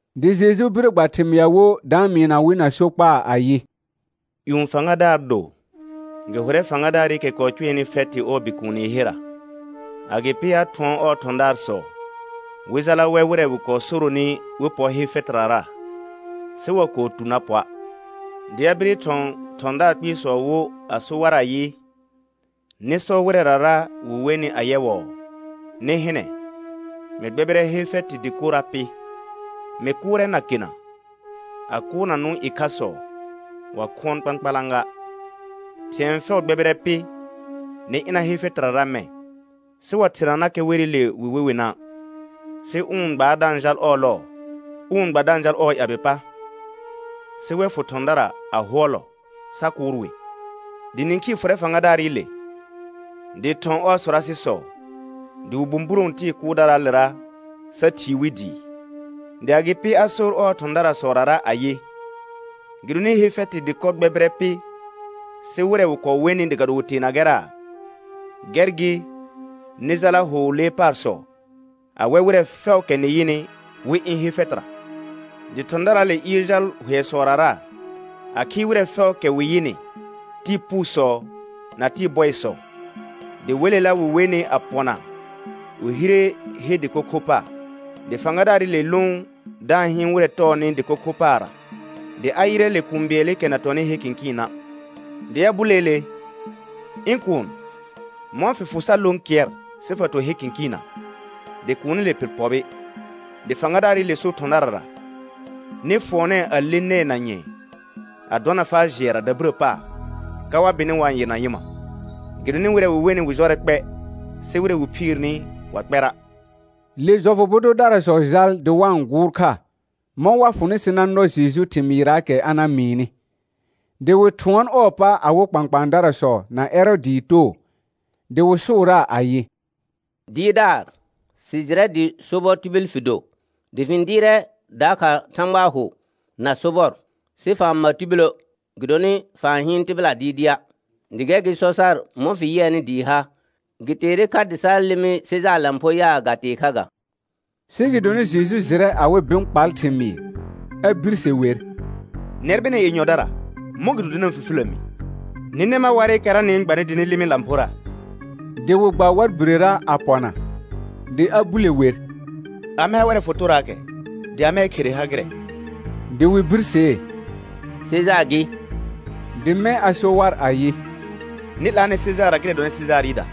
Dɩ Jeju bire gba thɩmɩa wo da-n mɩɩna wɩ na sokpaa ayɩ: Yũ fãgadaar do, gɩ hʋrɛ fãgadaarɩkɛ kɔɔ cʋɛnɩ fɛtɩ ɔɔ bikuuni herra. Agɩpɩ a thʋɔn ɔɔ thɔ̃daarsɔ wɩ jala wɛ wɩrɛ wɩ kɔɔ soronɩ wɩ pɔ he fɛtɩrara, sɩ wa kɔɔ tu na pɔa'. Dɩ a bire thɔ̃ thɔ̃daar kpɩɩsɔ wo a so war ayɩ: Nɩ sɔ wɩrɛrara wɩ wenɩ ayɛwɔɔ: Nɩ hɩnɛ, mɩ gbɛbɩrɛ he fɛtɩ dɩkorra pɩ, mɩ kʋʋrɛ nakena, a kʋʋrna nʋ̃ ƴɩkhasɔ wa khʋɔn kpãkpalã ga; thɩ̃ɛ fɛʋ gbɛbɩrɛ pɩ, nɩ ɩna he fɛtɩrara mɛ̃. Sɩ wa thernanakɛ werɩle wɩ we wɩna'; sɩ ʋ n gbaar da-n jal ɔɔ lɔɔ, ʋ n gba da-n jal ɔɔ ƴabɩ pa. Sɩ wɛ fʋ thɔ̃dara a hʋɔlɔ sa kʋʋr wɩ. Dɩ nĩkhii fʋrɛ fãgadaarɩle dɩ thɔ̃ ɔɔ sɔrasɩsɔ, dɩ wɩ bũburõ tɩɩ kʋʋrdaraalera sa thii wi dɩɩ. Dɩ agɩpɩ a sor ɔɔ thɔ̃daarsɔrara ayɩ: Gɩdonɩ he fɛtɩ dɩkɔ gbɛbɩrɛ pɩ, sɩ wɩrɛ wɩ kɔɔ wenɩ dɩ ga do wɩ teena gɛra', gɛr gɩ, nɩ jala hʋ lee paarsɔ a wɛ wɩrɛ fɛʋʋkɛ nɩ yɩnɩ, wɩ ɩ̃ he fɛtɩra. Dɩ thɔ̃daraale ɩɩr jal hʋɛsɔrara a khɩɩ wɩrɛ fɛʋʋkɛ wɩ yɩnɩ, tɩɩ puusɔ na tɩɩ bɔɩsɔ, dɩ welela wɩ wenɩ a pɔna wɩ hire he dɩko kho paar. Dɩ fãgadaarɩle lʋʋn da-n hɩɩn wɩrɛ tɔɔnɩ dɩko kho paarra, dɩ a yɩrɛ le kũu bɩɛlɩkɛ na tɔnɩ he kɩ̃kɩɩna'. Dɩ a buleele: Ɩ̃ kuun, mɔ̃ fɩ fʋ sa lõ kɩɛr, sɩ fa to he kɩ̃kɩɩna'; dɩ kuunile pɩr pɔbɩ. Le fãgadaarɩle so thɔ̃darara: Nɩ fʋɔnɛɛ a le nɛɛ na nyɛ̃ɛ a dɔna faa jɩɛra dabirə paar, ka wa bɩnɩ wa-n yɩrna nyɩma. Gɩdonɩ wɩrɛ wɩ wenɩ wɩ jɔrɛ kpɛ, sɩ wɩrɛ wɩ phiirni wa kpɛra'. Le jɔfʋ bʋ dʋdarasɔ jal dɩ wa-n gʋʋr kha, mɔ̃ wa fʋnɩ sɩ na nɔ Jeju thɩmɩɩraakɛ a na mɩɩnɩ. Dɩ wɩ thʋɔn ɔɔ pa awɩ kpãkpãadarasɔ na Ɛrɔɔdɩɩ too, dɩ wɩ sʋʋraa ayɩ: Dɩɩrdaar, sɩ jɩrɛ dɩ sobɔ tibil fɩ do, dɩ fɩ-n dɩɩrɛ dakha Thãgbaa hʋ na sobɔr sɩ fa-n ma tibilə', gɩdonɩ fa-n hɩɩn tɩbɩla dɩɩdɩa'; dɩ gɛr gɩ sɔ sar mɔ̃ fɩ yɩɛnɩ dɩɩ ha. Gɩ teere kha dɩ sa lɩmɩ Sejaar lãpho yaa, ga tee kha ga. Sɩ gɩdonɩ Jeju jɩrɛ awɩ bɩ̃ kpal thɩmɩɩ, a birse wer: Nɛr bɩnɛ yenyɔdara, mɔ̃gɩdo dɩ na-n fifilə mi? Nɩ nɛ mar warɩkɛra nɩ-n gbanɩ dɩ nɩ lɩmɩ lãphora. Dɩ wɩ gba war birera a pɔna. Dɩ a bule wer: Amɛ ha ʋrɛ fotoraakɛ, dɩ amɛɛ khere ha gɩrɛ? Dɩ wɩ birsee: Sejaar gɩ. Dɩ mɛ̃ a so war ayɩ: Nɩ 'laanɛ Sejaarra gɩrɛ dɔnɩ Sejaarɩda,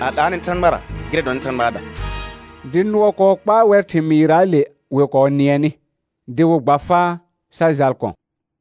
a 'laanɛ Thãgbara gɩrɛ dɔnɩ Thãgbaada. Dɩ nʋɔ kɔɔ kpaa wɛr thɩmɩɩraale wɩ kɔɔ nɩɛnɩ, dɩ wɩ gba faa sa jal kɔ̃.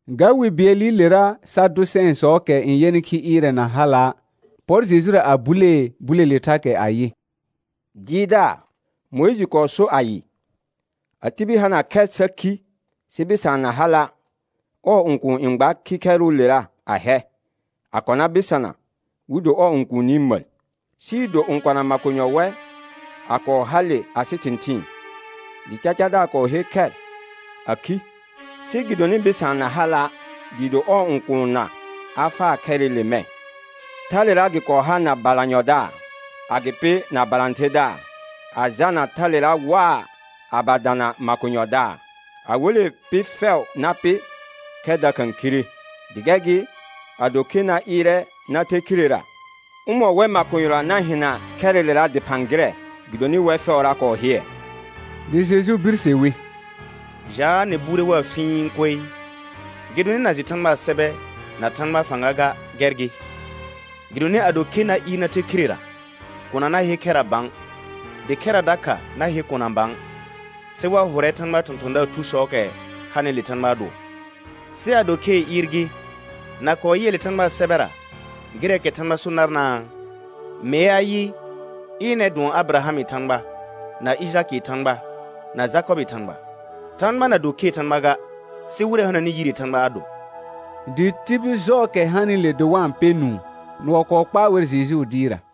Ga wi bɩɛlɩlera Sadʋsɛ̃ɛsɔɔkɛ n yɛnɩ khi ɩɩrɛ na hala', pɔr Jejura a bulee bulele thakɛ ayɩ: Dɩɩrdaar, Mʋɩjɩ kɔɔ sor ayɩ: «A tibil hana khɛr sa khi sɩ bɩsaan na hala', ɔɔ õkuun n gba khikhɛrʋʋlera a hɛ a kɔna bɩsana wɩ do ɔɔ õkuuni məl.» Sɩɩ do õkona makonyɔ wɛ a kɔɔ hale asɩ thɩ̃thɩɩn, dɩ cacadaar kɔɔ her khɛr a khi, sɩ gɩdonɩ bɩsaan na hala' dɩɩ do ɔɔ õkuunna a faa khɛrɩle mɛ̃. Thalera gɩ kɔɔ ha na balanyɔdaar, agɩpɩ na balãtherdaar, a jalna thalera waa a ba dana makonyɔdaar. A wele pɩ fɛʋ na pɩ, khɛr dakha khire. Dɩ gɛr gɩ, ado khe na ɩɩrɛ na the khirera, ʋmɔ̃ wɛr makonyɔra na hɩna khɛrɩlera dɩphã gɩrɛ, gɩdonɩ wɛr fɛʋra kɔɔ hɩɛ. Dɩ Jeju birse wi: Jaa, nɩ buure waa fĩi koe, gɩdonɩ na jɩ Thãgbaa sɛbɛ na Thãgbaa fãga ga, gɛr gɩ. Gɩdonɩ ado khe na ɩɩr na the khirera, kona na he khɛra bã, dɩ khɛra dakha na he kona bã, sɩ wa hʋrɛ Thãgbaa thɔ̃thɔ̃daar thusɔɔkɛ hanɩle Thãgbaa dʋɔ. Sɩ ado khee ɩɩr gɩ, na kɔɔ yɩɛ le Thãgbaa sɛbɛra gɩrɛɛkɛ Thãgba so narnaa? Mee ayɩ: «Ɩnɛr dʋɔn Abɩrahamɩ Thãgba, na Ɩjakɩɩ Thãgba, na Jakɔbɩɩ Thãgba.» Thãgba na do khee Thãgba ga, sɩ wɩrɛ hananɩ yiree Thãgba a do. Dɩ tibil jɔɔkɛ hande dɩ wa-n pɛ nũu, nʋɔ kɔɔ kpaa wɛr Jejuu dɩɩrra.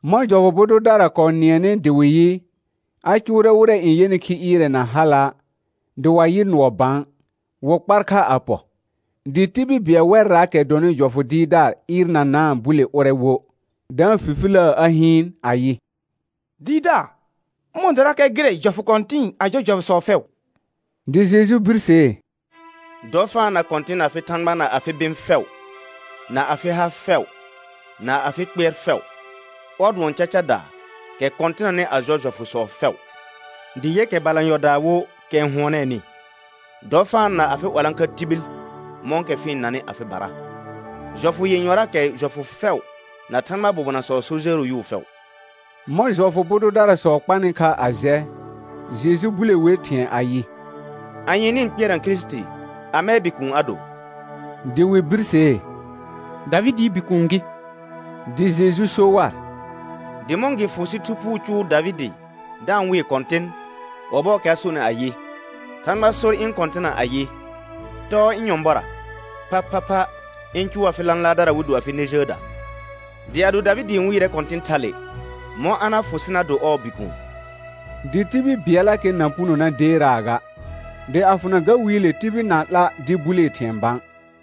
Mɔ̃ jɔfʋ bʋ dʋdara kɔɔ nɩɛnɩ dɩ wɩ yɩ, a cʋʋrɛ wɩrɛ n yɛnɩ khi ɩɩrɛ na hala', dɩ wa yɩ nʋɔ bã, wɩ kpar kha a pɔ. Dɩ tibil bɩɛl wɛrraakɛ dɔnɩ jɔfʋ dɩɩrdaar ɩɩrnanaa bule ʋrɛ wo, da-n fifiləə a hɩɩn ayɩ: Dɩɩrdaar, ʋmɔ̃ dɔrakɛ gɩrɛ jɔfʋ kɔ̃tɩ̃ɩ a jɔ jɔfʋsɔ fɛʋ? Dɩ Jeju birsee: «Dɔ fa-n na Kɔ̃tɩn afɩ Thãgba na afɩ bɩ̃ fɛʋ, na afɩ ha fɛʋ, na afɩ kpɩɛr fɛʋ.» Ɔr dʋɔn cacadaa, kɛ kɔ̃tɩnanɩ a jɔ jɔfʋsɔ fɛʋ. Dɩ yɛ kɛ balanyɔdaa wo kɛ n hʋɔnɛɛnɩ: «Dɔ fa-n na afɩ 'walãkha tibil mɔ̃kɛ fɩ-n nanɩ afɩbara.» Jɔfʋ yenyɔraakɛ jɔfʋ fɛʋ na Thãgbaa bobonasɔɔ so jəəro yʋʋ fɛʋ. Mɔ̃ jɔfʋ bʋ dʋdarasɔ kpanɩ kha a jɛ, Jeju bule wer thɩ̃ɛ ayɩ: Anye nɩ-n kpɩɛrna Kirisiti? Amɛɛ bikuun a do? Dɩ wɩ birsee: Davɩdɩɩ Bikuun gɩ. Dɩ Jeju so war: Dɩ mɔ̃ gɩ fʋ sɩ Thu Phuu cʋʋ Davɩdɩ da-n wɩɩ Kɔ̃tɩn, ɔbɔɔkɛ a sonɩ ayɩ: «Thãgba sor ɩ̃ Kɔ̃tɩna ayɩ: Tɔɔ ɩ̃ nyɔ̃bɔra, phaphapha ɩ̃ cʋʋ afɩ lãlaardara wɩ do afɩ nɛ jəəda.» Dɩ ado Davɩdɩ n wɩɩrɛ Kɔ̃tɩn thale, mɔ̃ a na fʋ sɩ na do ɔɔ bikuun? Dɩ tibil bɩɛllakɛ na puno na deeraa ga. Dɩ a fʋna ga wiile tibil na-n 'la dɩ bulee thɩ̃ɛ bã.